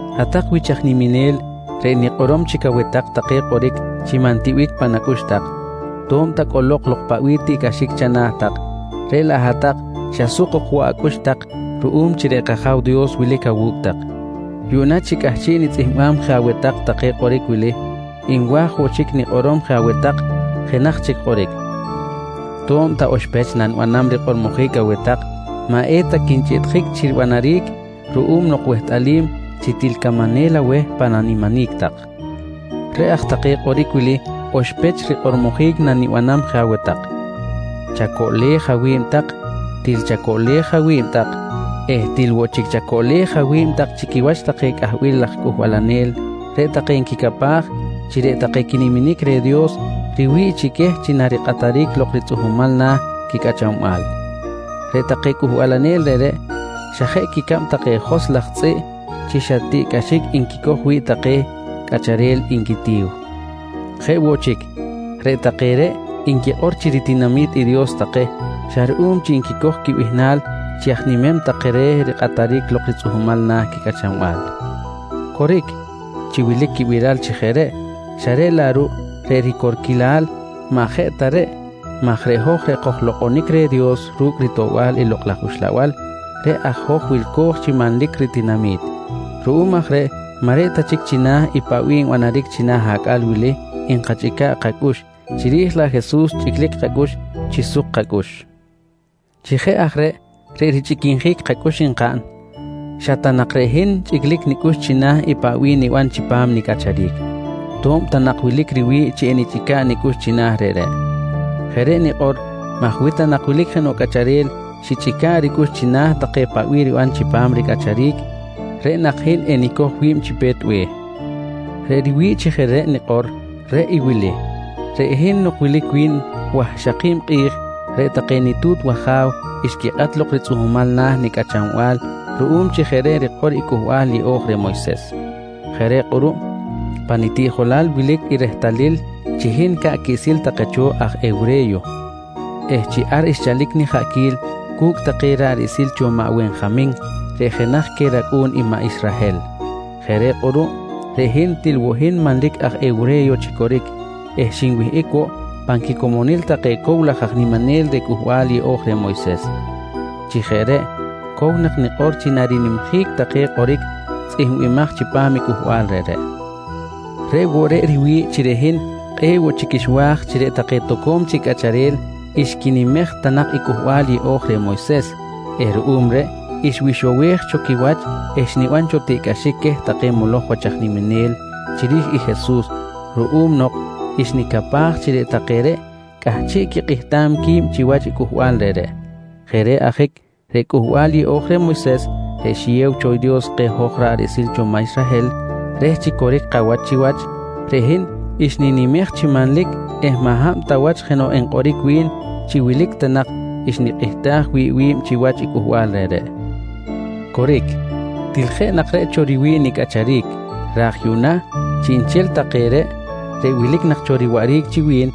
Hat-tak wich aj niminel, reꞌ hin nikꞌorom chic aweh tak take kꞌoric chi maꞌ ntiꞌbic pan acꞌux tak. To̱b ta cꞌolok lok paꞌ bih tiꞌcꞌaxic chana̱ tak, reꞌ laꞌ hat-tak xa suk ok woꞌ acꞌux tak ruꞌum chi reꞌ kAja̱w Dios wilic awu̱cꞌ tak. Yuꞌna chi cꞌahchiꞌ nitzꞌihmbam je aweh tak take kꞌoric wili, nwa̱j woꞌ chic nikꞌorom je aweh tak jenaj chic kꞌoric. To̱b ta oxpech nanibanam rikꞌormojic aweh tak maꞌ eta quinchꞌiꞌtjic chi ribanaric ruꞌum nok wehtꞌalim chi til camanel aweh pan animinic tak. Reꞌ aj take kꞌoric wili oxpech rikꞌormojic nanibanam je aweh tak: Chacoꞌlej awi̱b tak! Til chacoꞌlej awi̱b tak! Eh til woꞌ chic chacoꞌlej awi̱b tak chi quiwach take cꞌahbil laj cꞌuhbalanel reꞌ nquicapaj chi reꞌ take quiniminic reh Dios riwi̱ꞌ chi queh chi narikꞌataric lok ritzꞌuhmal na̱ quicꞌachanbal. Reꞌ take cꞌuhbalanel reꞌreꞌ, xa jeꞌ quicab take joskꞌ laj tzꞌiꞌ chi xa tiꞌcꞌaxic nquicoj wi̱ꞌ take cꞌacharel nquitiw. Jeꞌ woꞌ chic, reꞌ take reꞌ nquikꞌor chi ritinami̱t Dios take xa ruꞌum chi nquicoj quibihnal chi aj nimem take reh rikꞌataric lok ritzꞌuhmal na̱ quicꞌachanbal. Coric chi wilic quibiral chi jeꞌ reꞌ, xa reꞌ laꞌ ruꞌ reꞌ ricorquilal maꞌ jeꞌ ta reꞌ maj reꞌ hoj reꞌ kojlokꞌonic reh Dios ru̱cꞌ ritoꞌbal i Lokꞌ laj Uxlabal reꞌ aj hoj wilco̱j chi manlic ritinami̱t. Ruꞌum aj reꞌ maꞌ reꞌ ta chic china̱ i paꞌ bih nbanaric china̱ acꞌal wili nkachꞌica̱ꞌ kacꞌux, chiri̱j laꞌ Jesus chꞌiclic kacꞌux chi suk kacꞌux. Chi jeꞌ aj reꞌ richꞌiquinjic kacꞌux nkaꞌn, xa ta nak reꞌ hin chꞌiclic nicꞌux china̱ i paꞌ bih nibanam chipam nicꞌacharic, to̱b ta nak wilic riwi̱ꞌ chi enichꞌica̱ꞌ nicꞌux china̱ reꞌreꞌ. Jeꞌ reꞌ nikꞌor maj wi ta nak wilic jenoꞌ cꞌacharel xichꞌica̱ꞌ ricꞌux china̱ take paꞌ bih ribanam chipam ricꞌacharic, reꞌ nak hin enicoj wi̱b chi pe̱t be̱h. Reꞌ riwi̱ꞌ chi jeꞌ reꞌ nikꞌor, reꞌ i wili: Reꞌ hin nok wilic wi̱n wahxaki̱b kꞌi̱j reꞌ take nitu̱t waja̱w xquikꞌat lok ritzꞌuhmal na̱ nicꞌachanbal ruꞌum chi jeꞌ reꞌ rikꞌor i Cꞌuhbal Yeꞌo̱j reh Moyses. Jeꞌ reꞌ kꞌuruꞌ pa nitiꞌjolal wilic i rehtalil chi hin ca̱ꞌ quiꞌsil take cho aj hewre̱yo eh chi ar xchalic nijaꞌquil cu̱cꞌ take ra̱ꞌ riꞌsil cho maꞌ Wenjamin reꞌ jenaj queh racꞌu̱n i maꞌ Israhel. Jeꞌ reꞌ kꞌuruꞌ reꞌ hin til woꞌ hin manlic aj hewre̱yo chi coric eh xinwihꞌic woꞌ pan quicomonil take cow laj aj niminel reh Cꞌuhbal Yeꞌo̱j reh Moyses. Chi jeꞌ reꞌ cow nak nikꞌor chi narinimjic take kꞌoric tzꞌihmbimaj chipam i cꞌuhbal reꞌreꞌ. Reꞌ woꞌ reꞌ riwi̱ꞌ chi reꞌ hin kꞌe̱ꞌ woꞌ chic xwa̱j chi reꞌ take toco̱m chic cꞌacharel xquinimej ta nak i Cꞌuhbal Yeꞌo̱j reh Moyses eh ruꞌum reꞌ xwixowej cho quiwach eh xniban cho tiꞌcꞌaxic queh take moloj wach aj niminel chiri̱j i Jesus ruꞌum nok xnicapaj chi reꞌ take reꞌ cꞌahchiꞌ quikꞌihtam qui̱b chiwach i cꞌuhbal reꞌreꞌ. Jeꞌ reꞌ ajic reꞌ Cꞌuhbal Yeꞌo̱j reh Moyses reꞌ xiyew cho Dios keh hoj ra̱ꞌ riꞌsil maꞌ Israhel reh chi coric kawach chiwach, reꞌ hin xninimej chi manlic eh maꞌ hab ta wach jenoꞌ enkꞌoric wi̱n chi wilic ta nak xnikꞌihtaj wi̱ꞌ wi̱b chiwach i cꞌuhbal reꞌreꞌ. Coric, til jeꞌ nak reꞌ cho riwi̱ꞌ nicꞌacharic raj yuꞌna chiꞌnchel take reꞌ, reꞌ wilic nak cho riwaꞌric chi wi̱n,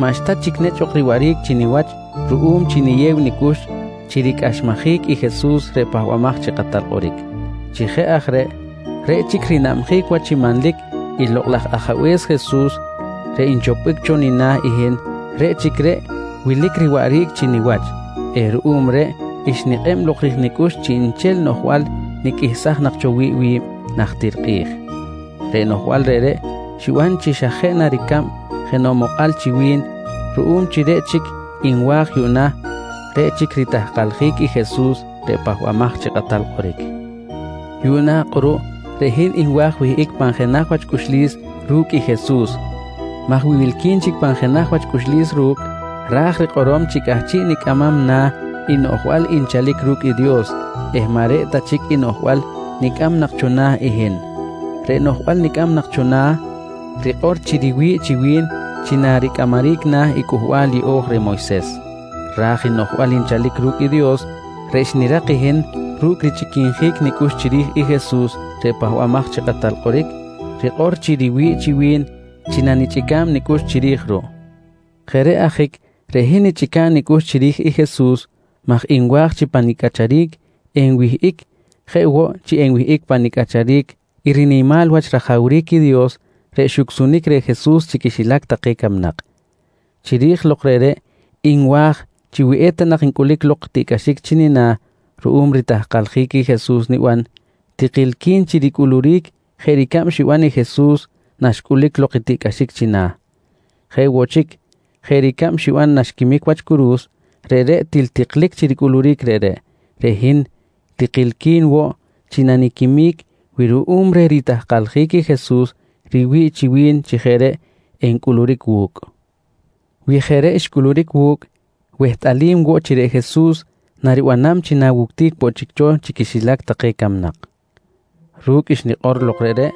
maꞌxta chic nechꞌ ok riwaꞌric chi niwach ruꞌum chi niyew nicꞌux chi ricꞌaxmajic i Jesus reꞌ Pahbamaj chi Kꞌatal Kꞌoric. Chi jeꞌ aj reꞌ, reꞌ chic rinabjic wach chi manlic i Lokꞌ laj Ajabe̱s Jesus reꞌ nchopbic cho nina̱ i hin, reꞌ chic reꞌ wilic riwaꞌric chi niwach eh ruꞌum reꞌ xnikꞌeb lok ri̱j nicꞌux chiꞌnchel noꞌjbal niqꞌuihsaj nak cho wi̱ꞌ wi̱b najtir kꞌi̱j. Reꞌ noꞌjbal reꞌreꞌ xiban xa jeꞌ na ricab jenoꞌ mokꞌal chi wi̱n ruꞌum chi reꞌ chic nwa̱j yuꞌna, reꞌ chic ritahkaljic i Jesus reꞌ Pahbamaj chi Kꞌatal Kꞌoric. Yuꞌna kꞌuruꞌ reꞌ hin nwa̱j wihꞌic pan jenaj wach cꞌuxlis ru̱cꞌ i Jesus maj wi wilqui̱n chic pan jenaj wach cꞌuxlis ru̱cꞌ, ra̱j rikꞌorom chi cꞌahchiꞌ nicꞌamam na̱ i noꞌjbal nchalic ru̱cꞌ i Dios eh maꞌ reꞌ ta chic i noꞌjbal nicꞌam nak cho na̱ i hin. Reꞌ noꞌjbal nicꞌam nak cho na̱, rikꞌor chi riwi̱ꞌ chi wi̱n chi naricꞌamaric na̱ i Cꞌuhbal Yeꞌo̱j reh Moyses. Ra̱j i noꞌjbal nchalic ru̱cꞌ i Dios reꞌ xnirak i hin ru̱cꞌ richꞌiquinjic nicꞌux chiri̱j i Jesus reꞌ Pahbamaj chi Kꞌatal Kꞌoric, rikꞌor chi riwi̱ꞌ chi wi̱n chi nanichꞌica̱b nicꞌux chiri̱j ruꞌ. Jeꞌ reꞌ ajic reꞌ hin nichꞌica̱ꞌ nicꞌux chiri̱j i Jesus maj nwa̱j chi pa nicꞌacharic enwihꞌic jeꞌ woꞌ chi enwihꞌic pa nicꞌacharic i rinimal wach rajawric i Dios reꞌ xucsunic reh Jesus chi quixilac take camnak. Chiri̱j lok reꞌreꞌ nwa̱j chi wi eta nak ncꞌulic lok i tiꞌcꞌaxic chi nina̱ ruꞌum ritahkaljic i Jesus niban, tikilqui̱n chi ricꞌuluric jeꞌ ricab xiban i Jesus naxcꞌulic lok tiꞌcꞌaxic china̱. Jeꞌ woꞌ chic jeꞌ ricab xiban naxquimic wach curu̱s reꞌreꞌ til tiklic chi ricꞌuluric reꞌreꞌ, reꞌ hin tikilqui̱n woꞌ chi naniquimic wi ruꞌum reh ritahkaljic i Jesus riwi̱ꞌ chi wi̱n chi jeꞌ reꞌ encꞌuluric wu̱cꞌ. Wi jeꞌ reꞌ xcꞌuluric wu̱cꞌ, wehtꞌal woꞌ chi reꞌ Jesus naribanam chi nawuctic woꞌ chic cho chi quixilac take camnak. Ru̱cꞌ xnikꞌor lok reꞌreꞌ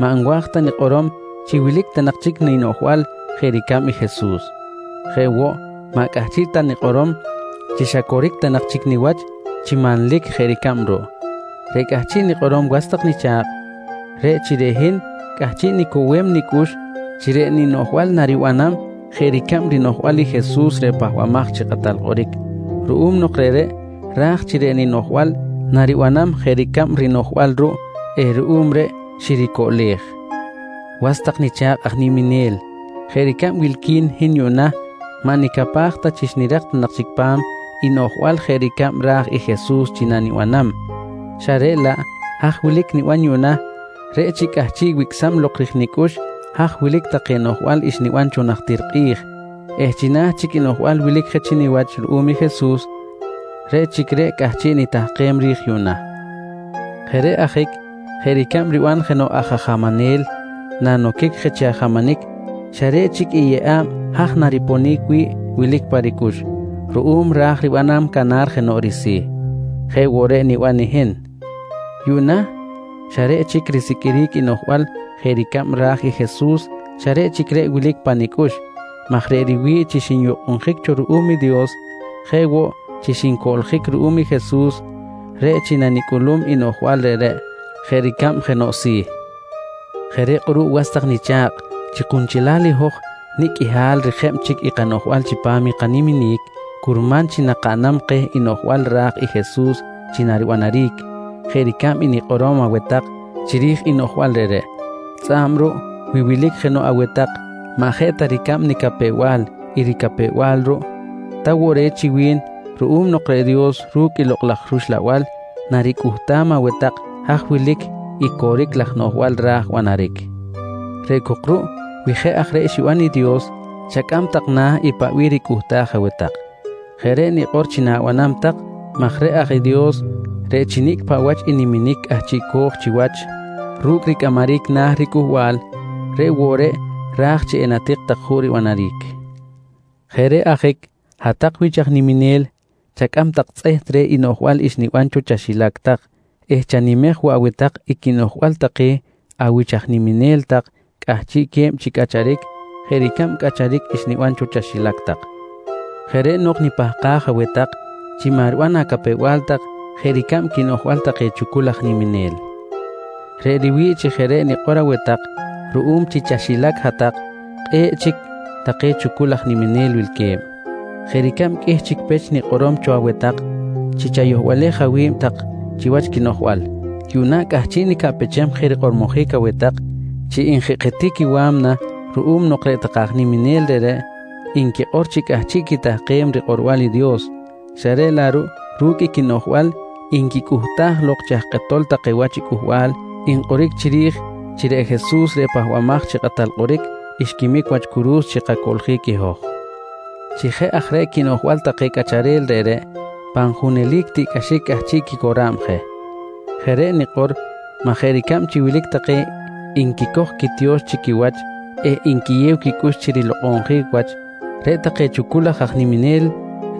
maꞌ nwa̱j ta nikꞌorom chi wilic ta nak chic ninoꞌjbal jeꞌ ricab i Jesus. Jeꞌ woꞌ maꞌ cꞌahchiꞌ ta nikꞌorom chi xa coric ta nak chic niwach chi manlic jeꞌ ricab ruꞌ. Reꞌ cꞌahchiꞌ nikꞌorom was tak nicha̱kꞌ, reꞌ chi reꞌ hin cꞌahchiꞌ nicowem nicꞌux chi reꞌ ninoꞌjbal naribanam jeꞌ ricab rinoꞌjbal i Jesus reꞌ Pahbamaj chi Kꞌatal Kꞌoric, ruꞌum nok reꞌreꞌ ra̱j chi reꞌ ninoꞌjbal naribanam jeꞌ ricab i rinoꞌjbal ruꞌ eh ruꞌum reꞌ xiricoꞌlej. Was tak nicha̱kꞌ aj niminel, jeꞌ ricab wilqui̱n hin yuꞌna maꞌ nicapaj ta chi xnirak ta nak chic pa̱m i noꞌjbal jeꞌ ricab ra̱j i Jesus chi nanibanam xa reꞌ laꞌ haj wilic niban yuꞌna reꞌ chi cꞌahchiꞌ wicꞌsam lok ri̱j nicꞌux haj wilic take noꞌjbal xniban cho najtir kꞌi̱j eh china̱ chic i noꞌjbal wilic je chi niwach ruꞌum i Jesus, reꞌ chic reꞌ cꞌahchiꞌ nitahkem ri̱j yuꞌna. Jeꞌ reꞌ ajic jeꞌ ricab riban jenoꞌ aj ajamanel nanoquic je chi ajamanic xa reꞌ chic i yeꞌa̱b haj nariponic wi̱ꞌ wilic pa ricꞌux ruꞌum ra̱j ribanam canar jenoꞌ risi̱, jeꞌ woꞌ reꞌ niban i hin. Yuꞌna xa reꞌ chic risiqꞌuiric i noꞌjbal jeꞌ ricab ra̱j i Jesus xa reꞌ chic reꞌ wilic pa nicꞌux maj reꞌ riwi̱ꞌ chi xinyukꞌunjic cho ruꞌum i Dios jeꞌ woꞌ chi xincoꞌljic ruꞌum i Jesus, reꞌ chi nanicꞌulum i noꞌjbal reꞌreꞌ jeꞌ ricab jenoꞌ si̱. Jeꞌ reꞌ kꞌuruꞌ was tak nicha̱kꞌ, chi kunchelal i hoj nicꞌ qꞌuihal rijeb chic i kanoꞌjbal chipam i kaniminic, curman chi nakaꞌnam keh i noꞌjbal ra̱j i Jesus chi naribanaric jeꞌ ricab i nikꞌorom aweh tak chiri̱j i noꞌjbal reꞌreꞌ. Tzꞌa̱b ruꞌ wi wilic jenoꞌ aweh tak maꞌ jeꞌ ta ricab nicapew-bal i ricapew-bal ruꞌ, ta woꞌ re̱t chi wi̱n ruꞌum nok reꞌ Dios ru̱cꞌ i Lokꞌ laj rUxlabal naricꞌuhtam aweh tak haj wilic i coric laj noꞌjbal ra̱j banaric. Reꞌ cok ruꞌ wi jeꞌ aj reꞌ xiban i Dios, chacꞌam tak na̱ i paꞌ bih ricꞌuhtaj aweh tak. Jeꞌ reꞌ nikꞌor chi na̱banam tak maj reꞌ ra̱j i Dios reꞌ chi nicꞌ paꞌ wach i niminic cꞌahchiꞌco̱j chiwach ru̱cꞌ ricꞌamaric na̱ ricꞌuhbal, reꞌ woꞌ reꞌ ra̱j chi enkatik juꞌ ribanaric. Jeꞌ reꞌ ajic hat-tak wich aj niminel, chacꞌam tak tzꞌeht reh i noꞌjbal xniban cho chaxilac tak eh chatijej woꞌ aweh tak i quinoꞌjbal take awich aj niminel tak cꞌahchiꞌque̱b chi cꞌacharic jeꞌ ricab cꞌacharic xniban cho chaxilac tak. Jeꞌ reꞌ nok nipahkam aweh tak chi maꞌ riban acapew-bal tak jeꞌ ricab quinoꞌjbal take chucul laj aj niminel. Reꞌ riwi̱ꞌ chi jeꞌ reꞌ nikꞌor aweh tak ruꞌum chi chaxilac hat-tak kꞌe̱ꞌ chic take chucul aj niminel wilque̱b. Jeꞌ ricab qꞌuih chic pech nikꞌorom cho aweh tak chi chayohbalej awi̱b tak chiwach quinoꞌjbal, yuꞌna cꞌahchiꞌ nicaꞌpechem je rikꞌormojic aweh tak chi njikꞌjitic i wa̱mna ruꞌum nok reꞌ take aj niminel reꞌreꞌ nquikꞌor chi cꞌahchiꞌ quitahkem rikꞌorbal i Dios, xa reꞌ laꞌ ruꞌ ru̱cꞌ i quinoꞌjbal nquicꞌuhtaj lok chi aj kꞌetol take wach i cꞌuhbal nkꞌoric chiri̱j chi reꞌ Jesus reꞌ Pahbamaj chi Kꞌatal Kꞌoric xquimic wach curu̱s chi kacoꞌljic i hoj. Chi jeꞌ aj reꞌ quinoꞌjbal i take cꞌacharel reꞌreꞌ, pan junelic tiꞌcꞌaxic cꞌahchiꞌ quicora̱b je. Jeꞌ reꞌ nikꞌor maj jeꞌ ricab chi wilic take nquicoj quitiyo̱x chi quiwach eh nquiyew quicꞌux chi rilokꞌonjic wach, reꞌ take chucul laj niminel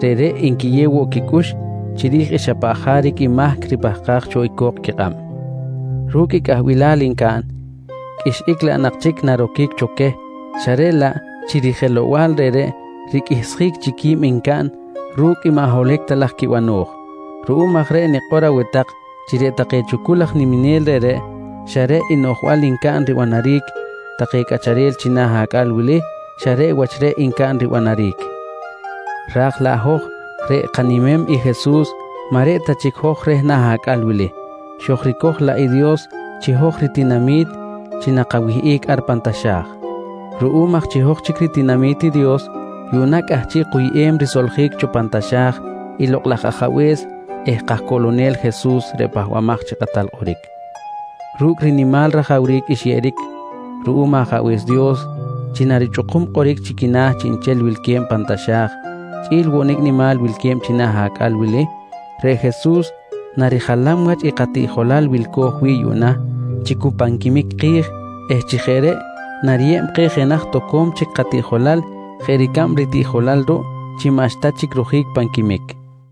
reꞌ nquiyew woꞌ quicꞌux chiri̱j i xa paꞌ jaric i mahc ripahkaj cho i co̱k quikꞌab. Ru̱cꞌ i cꞌahbilal ncaꞌn, qꞌuixꞌic laꞌ nak chic naroquic cho queh xa reꞌ laꞌ chi rijelow-bal reꞌreꞌ, riqꞌuihsjic chic qui̱b ncaꞌn ru̱cꞌ i maꞌ holohic ta laj quibano̱j. Ruꞌum aj reꞌ nikꞌor aweh tak chi reꞌ take chucul laj niminel reꞌreꞌ, xa reꞌ i noꞌjbal ncaꞌn ribanaric take cꞌacharel china̱ acꞌal wili, xa reꞌ wach reꞌ ncaꞌn ribanaric ra̱j laꞌ hoj reꞌ kanimem i Jesus maꞌ reꞌ ta chic hoj reh na̱ acꞌal wili, xojricoj laꞌ i Dios chi hoj ritinami̱t chi nakawihꞌic ar pan taxa̱j. Ruꞌum aj chi hoj chic ritinami̱t i Dios, yuꞌna cꞌahchiꞌ kuyꞌem risoljic cho pan taxa̱j i Lokꞌ laj Ajabe̱s eh kajcoꞌlonel Jesus reꞌ Pahbamaj chi Kꞌatal Kꞌoric. Ru̱cꞌ rinimal rajawric xyeꞌeric ruꞌum Ajabe̱s Dios chi narichꞌukum kꞌoric chi quina̱ chiꞌnchel wilque̱b pan taxa̱j chꞌi̱l woꞌ nicꞌ nimal wilque̱b china̱ acꞌal wili, reꞌ Jesus narijalam wach i katiꞌjolal wilco̱j wi̱ꞌ yuꞌna chi cu pan quimic ki̱j eh chi jeꞌ reꞌ nariyeb keh jenaj toco̱m chic katiꞌjolal jeꞌ ricab ritiꞌjolal ruꞌ chi maꞌxta chic rojic pan quimic.